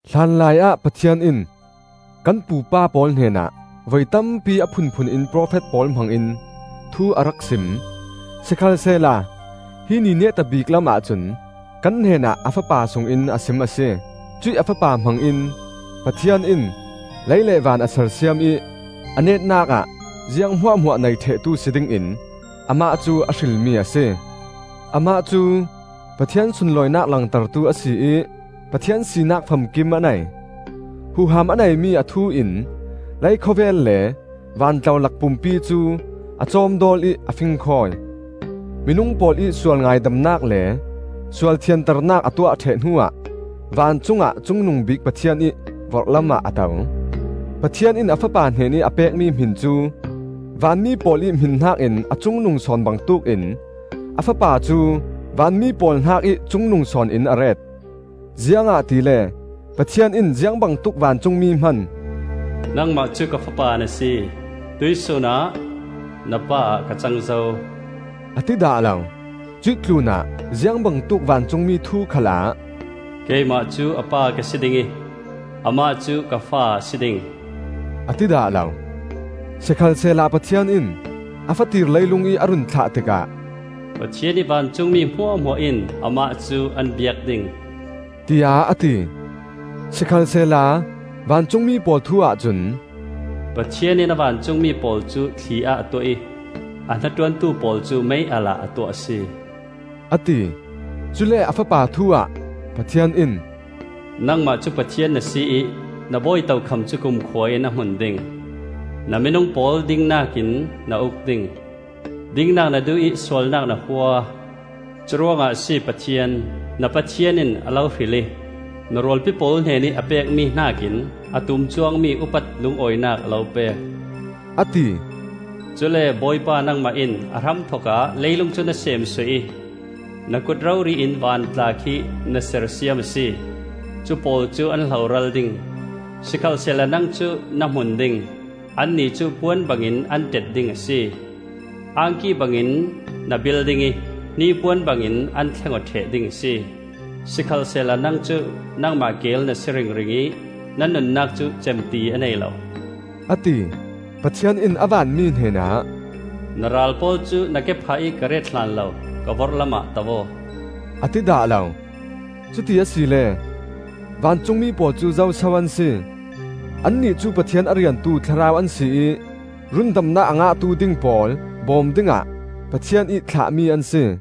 Hlanlaiah Pathian in kan pupa pawl hnenah voi tampi a phunphun in profet pawl hmangin thu a rak sim. Sikhalsehla hi ni neta bik lamah cun kan hnenah a Fapa sungin a sim a si. Cuih a Fapa hmangin Pathian in lei le van a sersiam ih a netnak ah ziang hmuahhmuah nei ṭhehtu si dingin Amah cu a hrilmi a si. Amah cu Pathian sunlawinak langtertu a si ih Pathian sinak famkim a nei. Huham a neimi a thu in leikhawvel le vantlolak pumpi cu a cawmdawl ih a fingkhawi. Minung pawl ih sual ngaidamnak le sual thianternak a tuah ṭheh hnuah vancungah Cungnungbik Pathian ih vorhlamah a to. Pathian in a Fapa hnenih a pekmi hmin cu vanmi pawl ih hmin hnakin a cungnung sawn bangtuk in a Fapa cu vanmi pawl hnakih cungnung sawn in a ret. Ziangahtile Pathian in ziangbangtuk vancungmi hman: “Nangmah cu ka Fapa na si; tuihsun ah na Pa ah ka cang zo,” a ti dah lo. Cuih tlunah ziangbangtuk vancungmi thu khalah, “Keimah cu a Pa ka si ding ih, amah cu ka Fa a si ding,” a ti dah lo. Sikhalsehla Pathian in a fatir leilungih a run thlah tikah, “Pathian ih vancungmi hmuahhmuah in amah cu an biak ding,” tiah a ti. Sikhalsehla vancungmi pawl thu ahcun, “Pathian in a vancungmi pawl cu thli ah a tuah ih, A hnaṭuantu pawl cu mei-alh ah a tuah a si,” a ti. Cule a Fapa thu ah Pathian in, “Nangmah cu Pathian na si ih, na bawi tokham cu kumkhua in a hmun ding; Na minung pawl dingnak in na uk ding. Dingnak na duh ih sualnak na hua. Curuangah a si Pathian, Na Pathian in a lo hril ih, Na rualpi pawl hnenih a pekmi hnakin a tum cuangmi upat lungawinak a lo pek,” a ti. “Cule Bawipa nangmah in a hramthokah leilung cu na seemsuah ih, Na kut rori in van tla khi na sersiam a si. Cu pawl cu an hloral ding, sikhalsehla nang cu na hmun ding. Annih cu puan bangin an ṭet ding a si. Angki bangin na bil ding ih hnipuan bangin an thleng aw ṭheh ding a si. Sikhalsehla nang cu nangmah keel na si ringring ih na nunnak cu cem ti a nei lo,” a ti. Pathian in a vanmi hnenah, “Na ral pawl cu na kephah ih ka ret hlan lo, ka vorhlamah to aw,” a ti dah lo. Cuti asile vancungmi pawl cu zo so an si? Annih cu Pathian a riantu thlarau an si ih rundamnak a ngahtu ding pawl bawm dingah Pathian ih thlahmi an si.